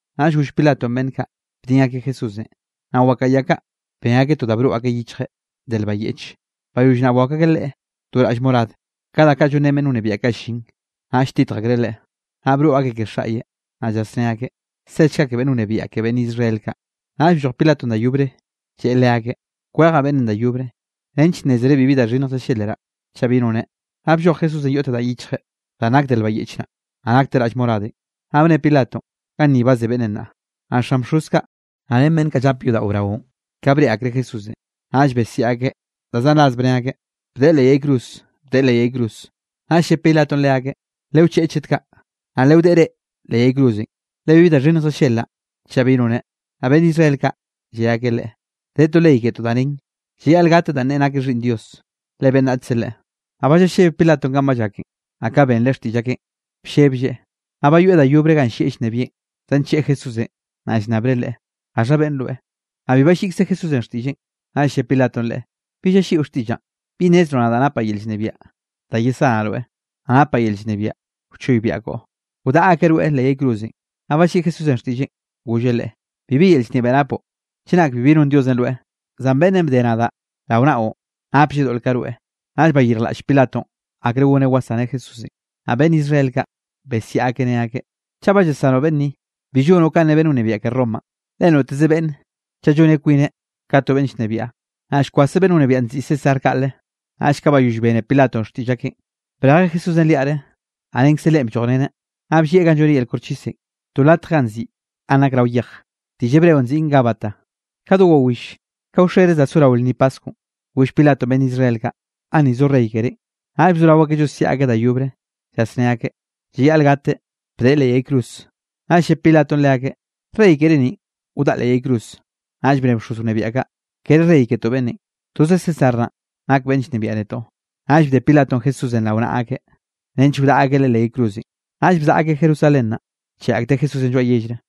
Naꞌll goll Pilatonꞌ beꞌnn kaꞌ, bdin akeꞌ Jesúsenꞌ. Naꞌ wakaꞌa ya kaꞌ, ben akeꞌ to da broꞌ akeꞌ yichjeꞌ de lba yeꞌche. Bayoll naꞌ, bwakw akeꞌ Leꞌe to raꞌll morad, ka da kaꞌ llonrén no beꞌnn wnebiaꞌ kaꞌ llin. Naꞌll lltitj akreꞌ Leꞌe, naꞌ broꞌ akeꞌ ke xaꞌyeꞌ, naꞌ llasné akeꞌ: —¡Sechga ke beꞌnn wnebiaꞌ ke beꞌnn Israel kaꞌ! Naꞌll blloj Pilatonꞌ da yobre lleꞌe leakeꞌ: —Kwejaꞌ beꞌnnenꞌ da yobre, nench nnézere bibi da xhinnj llallelraꞌ, chaꞌ bi noneꞌ. Naꞌ blloj Jesúsenꞌ yoꞌte danꞌ yichjeꞌ, danꞌ nak de lba yeꞌch naꞌ, naꞌ nakteꞌ raꞌll moradenꞌ. Naꞌ bne Pilatonꞌ: —Ganni ba ze beꞌnnenꞌ nnaꞌ. Naꞌ xan bxoz kaꞌ, naꞌ ren beꞌnn kaꞌ llape yodaꞌo braonꞌ, ka breꞌe akreꞌ Jesúsenꞌ, naꞌll besiaꞌ akeꞌ da zan ras bne akeꞌ: —¡Bdeꞌe leꞌ yay cruz! ¡Bdeꞌe leꞌ yay cruz! Naꞌll lle Pilatonꞌ leakeꞌ: —Lewcheꞌe chet kaꞌ, naꞌ lewdeꞌe reꞌ leꞌ yay cruzenꞌ, le bibi da xhinnj llallelraꞌ chaꞌ bi noneꞌ. Naꞌ beꞌnn Israel kaꞌ, lle akeꞌ leꞌe: —De to ley ketoꞌ da nen, llayaꞌl gateꞌ danꞌ neꞌe nakeꞌ Xhiꞌnn Dios, le beꞌnnachze Leꞌe. Naꞌ ba llalleb Pilatonꞌ kanꞌ ba llaken, naꞌ ka benreꞌ xtiꞌll akeꞌn, blleblleꞌ. Naꞌ bayoeꞌ da yobre ganꞌ llieꞌ llnebieꞌn, zancheꞌe Jesúsenꞌ, naꞌ llnnabreꞌ Leꞌe: —¿Gaxha beꞌnne rweꞌ? Naꞌ bi balliꞌkze Jesúsenꞌ xtiꞌlleꞌn. Naꞌll lle Pilatonꞌ Leꞌe: —¿Bi llalliꞌo xtiꞌllaꞌn? ¿Bi nnezroꞌ nadaꞌ napaꞌ yel llnebiaꞌ da yesanaꞌ rweꞌ, naꞌ napaꞌ yel llnebiaꞌ wchoybiaꞌ koꞌo, wdaꞌa akeꞌ rweꞌ leꞌ yay cruzenꞌ? Naꞌ balliꞌi Jesúsenꞌ xtiꞌlleꞌ, golleꞌ leꞌe: —Bibi yel llnebiaꞌ napoꞌ chenak bibi nonn Diosenꞌ rweꞌ. Zan beꞌnnenꞌ bde nadaꞌ rao naꞌon, naplleꞌ doꞌl ka rweꞌ. Naꞌll bayirjlaꞌll Pilatonꞌ akre goneꞌ wasaneꞌ Jesúsenꞌ. Naꞌ beꞌnn Israel kaꞌ, besiaꞌ akeꞌ ne akeꞌ: —Chaꞌ ba llasanoꞌ beꞌnn ni, bi llonoꞌ kanꞌ ne beꞌnn wnebiaꞌ ke Romanꞌ, le noteze beꞌnn chaꞌ lloneꞌ kwineꞌ ka to beꞌnn llnebiaꞌ, naꞌ llkwaseꞌ beꞌnn wnebiaꞌn nziꞌi César kaꞌle. Naꞌll ka bayoll bene Pilatonꞌ xtiꞌll akeꞌn, brejeꞌ Jesúsenꞌ liaꞌre, naꞌ renkze leꞌe bllojreneꞌ, naꞌ bllieꞌ ganꞌ lloneꞌ yel koxchisenꞌ, to latje danꞌ nziꞌi Ganꞌ Nak Rao Yej, diꞌll hebreo nziꞌn Gábata. Ka do wawill, ka wxere za sorao lnni Paskwnꞌ goll Pilatonꞌ beꞌnn Israel kaꞌ: —Ganni zo Rey kerénꞌ. Naꞌll bzorao akeꞌ llosiaꞌ akeꞌ da yobre, llasné akeꞌ: —¡Llayaꞌl gateꞌ! ¡Bdeꞌe leꞌ yay cruz! Naꞌll lle Pilatonꞌ leakeꞌ: —¿Rey keré ninꞌ, wdaꞌa Leꞌe leꞌ yay cruz? Naꞌll bne bxoz wnebiaꞌ kaꞌ: —Kere rey ketoꞌ beꞌnnenꞌ, toze César naꞌn nak beꞌnn llnebiaꞌ netoꞌ. Naꞌll bde Pilatonꞌ Jesúsenꞌ rao naꞌa akeꞌ, nench wdaꞌa akeꞌ Leꞌe leꞌ yay cruzenꞌ. Naꞌll bzaꞌa akeꞌ Jerusalén naꞌ, bcheꞌe akteꞌ Jesúsenꞌ lloaꞌ yellre.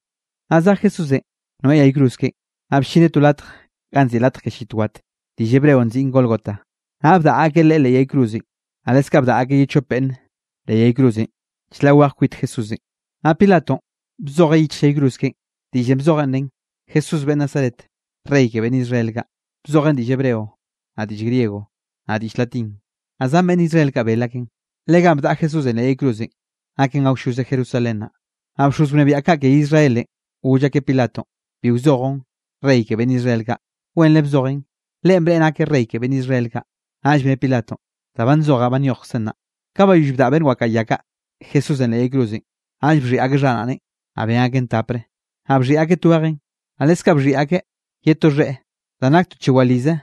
Naꞌ zej Jesúsenꞌ noeꞌ yay cruz keꞌen, naꞌ bllineꞌ to latje ganꞌ nziꞌi Latj ke Llit Wat, diꞌll hebreo nziꞌn Gólgota. Naꞌ bdaꞌa akeꞌ Leꞌe leꞌ yay cruzenꞌ, naꞌ leskaꞌ bdaꞌa akeꞌ ye chope beꞌnne leꞌ yay cruzenꞌ chlaꞌ weje kwit Jesúsenꞌ. Naꞌ Pilatonꞌ bzojeꞌ yichj yay cruz keꞌen. Diꞌllenꞌ bzojenꞌ nen: “Jesús beꞌnn Nazaret, Rey ke beꞌnn Israel kaꞌ”. Bzojeꞌn diꞌll hebreo, naꞌ diꞌll griego, naꞌ diꞌll latín. Naꞌ zan beꞌnn Israel kaꞌ bel akeꞌn, le ganꞌ bdaꞌa Jesúsenꞌ leꞌ yay cruzenꞌ, naken awlloze Jerusalén naꞌ. Naꞌ bxoz wnebiaꞌ kaꞌ ke Israelenꞌ, goll akeꞌ Pilatonꞌ: —Bi wzojoꞌn: “Rey ke beꞌnn Israel kaꞌ”, wenre bzojen: “Leꞌen bneꞌe nakeꞌ rey ke beꞌnn Israel kaꞌ.” Naꞌll bne Pilatonꞌ: —Da ba nzojaꞌ ba nyojkzen naꞌ. Ka bayoll bdaꞌa beꞌnn wakaꞌa ya kaꞌ Jesúsenꞌ leꞌ yay cruzenꞌ, naꞌll bxhiꞌi akeꞌ xharaꞌneꞌn, naꞌ ben akeꞌn tapre, naꞌ bxhiꞌi akeꞌ twejeꞌn. Naꞌ leskaꞌ bxhiꞌi akeꞌ ye to xheꞌe danꞌ nak to chewalize,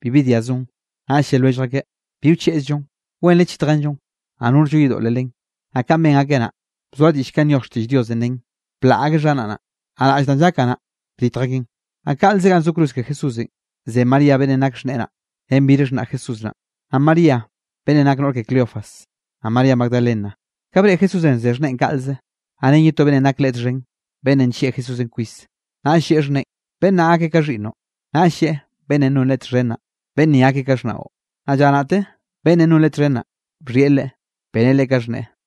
bibi dia zon. Naꞌll lle lwellj akeꞌ: —Bi wcheꞌzllon, wenre chitjenllon, naꞌ norllo yedoꞌle len. Naꞌ kanꞌ ben akeꞌ naꞌ, bzoa diꞌll kanꞌ nyoj xtiꞌll Diosenꞌ nen: “Blaꞌ akeꞌ xharaꞌnaꞌn, naꞌ raꞌll danꞌ llakaꞌ naꞌ, bditj akeꞌn.” Naꞌ kaꞌlze ganꞌ zo cruz ke Jesúsenꞌ, ze María beꞌnnenꞌ nak xhneꞌe naꞌ, ren bir xhnaꞌ Jesús naꞌ, naꞌ María beꞌnnenꞌ nakeꞌ noꞌr ke Cleofas, naꞌ María Magdalena. Ka breꞌe Jesúsenꞌ ze xhneꞌen kaꞌlze, naꞌ ren ye to beꞌnnenꞌ nak leꞌe txhen, beꞌnnenꞌ nllieꞌ Jesúsenꞌ kwis, naꞌll lleꞌe xhneꞌen: —Beꞌnn naꞌ gakeꞌ ka xhiꞌnnoꞌ. Naꞌll lleꞌe beꞌnnenꞌ non Leꞌe txhen naꞌ: —Beꞌnn ni gakeꞌ ka xhnaꞌo. Naꞌ lla naꞌte beꞌnnenꞌ non Leꞌe txhen naꞌ, bxhieꞌ leꞌe, beneꞌ leꞌe ka xhneꞌe.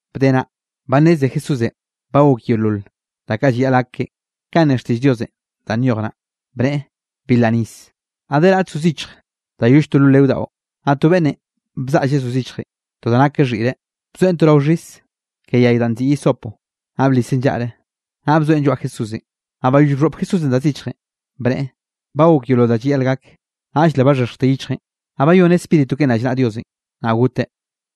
Bde naꞌ, ba nneze Jesúsenꞌ ba gok yeolol da kaꞌ llayaꞌl gak keꞌen, kanꞌ ne xtiꞌll Diosenꞌ danꞌ nyoj naꞌ, bneꞌe: —Bilraꞌ nis. Naꞌ de raꞌt zo zichj da yoll to lo leo daꞌo. Naꞌ to beꞌnnenꞌ bzaꞌlleꞌ zo zichjenꞌ to da nak ka xhiꞌre, bzoeꞌn to rao xhis ke yay danꞌ nziꞌi hisopo, naꞌ bliseꞌn llaꞌre, naꞌ bzoeꞌn lloaꞌ Jesúsenꞌ. Naꞌ bayoll bxhoꞌp Jesúsenꞌ da zichjenꞌ, bneꞌe: —Ba gok yeolol da llayaꞌl gak, naꞌll le baxhexjte yichjeꞌn, naꞌ bayoneꞌ spíritu keꞌen rallnaꞌa Diosenꞌ, naꞌ goteꞌ.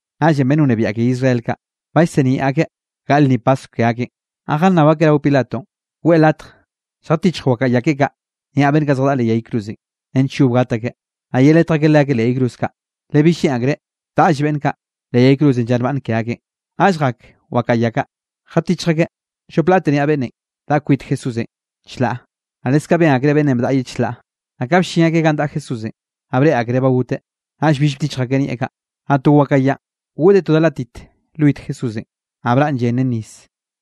Naꞌllenꞌ beꞌnn wnebiaꞌ ke Israel kaꞌ, ba llseniaꞌ akeꞌ gaꞌl lnni Paskw ke akeꞌn, naꞌ jannab akeꞌ rao Pilatonꞌ, weꞌe latj lljatichj wakaꞌa ya keꞌe kaꞌ niaꞌ beꞌnn kaꞌ zjadaꞌa leꞌ yay cruzenꞌ, nench yob gat akeꞌ, naꞌ yeletj akeꞌ leakeꞌ leꞌ yay cruz kaꞌ, le bill lleꞌn akreꞌ taꞌlle beꞌnn kaꞌ leꞌ yay cruzenꞌ lla nbaꞌnne ke akeꞌn. Naꞌll jak wakaꞌa ya kaꞌ, jatichj akeꞌ llop laꞌte niaꞌ beꞌnnenꞌ daꞌa kwit Jesúsenꞌ chlaꞌ. Naꞌ leskaꞌ ben akreꞌ beꞌnnenꞌ bdaꞌa ye chlaꞌ. Naꞌ ka bllin akeꞌ ganꞌ daꞌa Jesúsenꞌ, naꞌ breꞌe akereꞌ ba goteꞌ. Naꞌll bill bdichj akeꞌ nieꞌ kaꞌ. Naꞌ to wakaꞌa yanꞌ goꞌdeꞌ to da látit lwit Jesúsenꞌ, naꞌ braꞌn llen ren nis.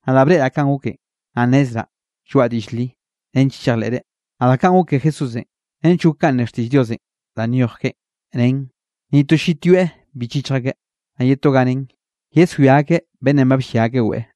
Nadaꞌ breꞌraꞌ kanꞌ goken, naꞌ nnezraꞌ lloaꞌa diꞌll li, nench chejleꞌ reꞌ. Naꞌ da kaꞌn gok ke Jesúsenꞌ, nench gok kanꞌ ne xtiꞌll Diosenꞌ danꞌ nyoj keꞌe, nen: “Ni to llit yoeꞌ bi chichj akeꞌ.” Naꞌ ye to ganꞌ nen: “Yeswia akeꞌ beꞌnnenꞌ ba bllia akeꞌ weꞌe.”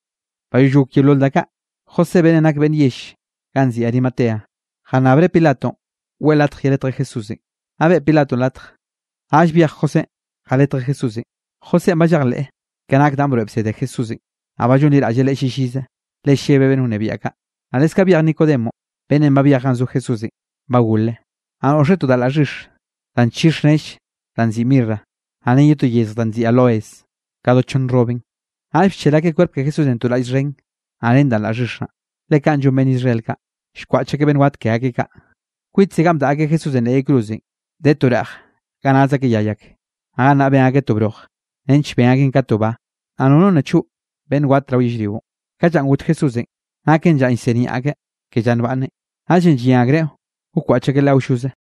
Bayoll gok yeolol da kaꞌ, José beꞌnnenꞌ nak beꞌnn yell ganꞌ nziꞌi Arimatea, jannabreꞌ Pilatonꞌ weꞌe latj yeletjeꞌ Jesúsenꞌ. Naꞌ beꞌe Pilatonꞌ latj. Naꞌll byej Josénꞌ jaletjeꞌ Jesúsenꞌ. Josénꞌ ba llejleꞌ ka nak danꞌ broeꞌ bsede Jesúsenꞌ, naꞌ ba llonliraꞌlleꞌ Leꞌe llillize, le llebeꞌ beꞌnn wnebiaꞌ kaꞌ. Naꞌ leskaꞌ byej Nicodemonꞌ beꞌnnenꞌ ba byej ganꞌ zo Jesúsenꞌ ba gole, naꞌ noꞌxe to da laꞌ xhix, da nchix nell danꞌ nziꞌi mirra, naꞌ ren to yezj danꞌ nziꞌi áloes, ka do chonn rrobenꞌ. Naꞌll bchel akeꞌ kwerp ke Jesúsenꞌ to raꞌll xhen, naꞌ ren danꞌ laꞌ xhix naꞌ, le kaꞌ llon beꞌnn Israel kaꞌ, llkwaꞌch akeꞌ beꞌnn wat ke akeꞌ kaꞌ. Kwitze ganꞌ bdaꞌa akeꞌ Jesúsenꞌ leꞌ yay cruzenꞌ, de to reꞌj ga naz akeꞌ yay ak. Naꞌ gannaꞌ ben akeꞌ to bloj, nench ben akeꞌn ka to ba, naꞌ nono nna choꞌ beꞌnn wat rao yellrionꞌ. Ka llanꞌ got Jesúsenꞌ naken llanꞌ llsiniaꞌ akeꞌ ke lla nbaꞌnne, naꞌllenꞌ llyen akreꞌ wkwaꞌch akeꞌ Leꞌe awlloze.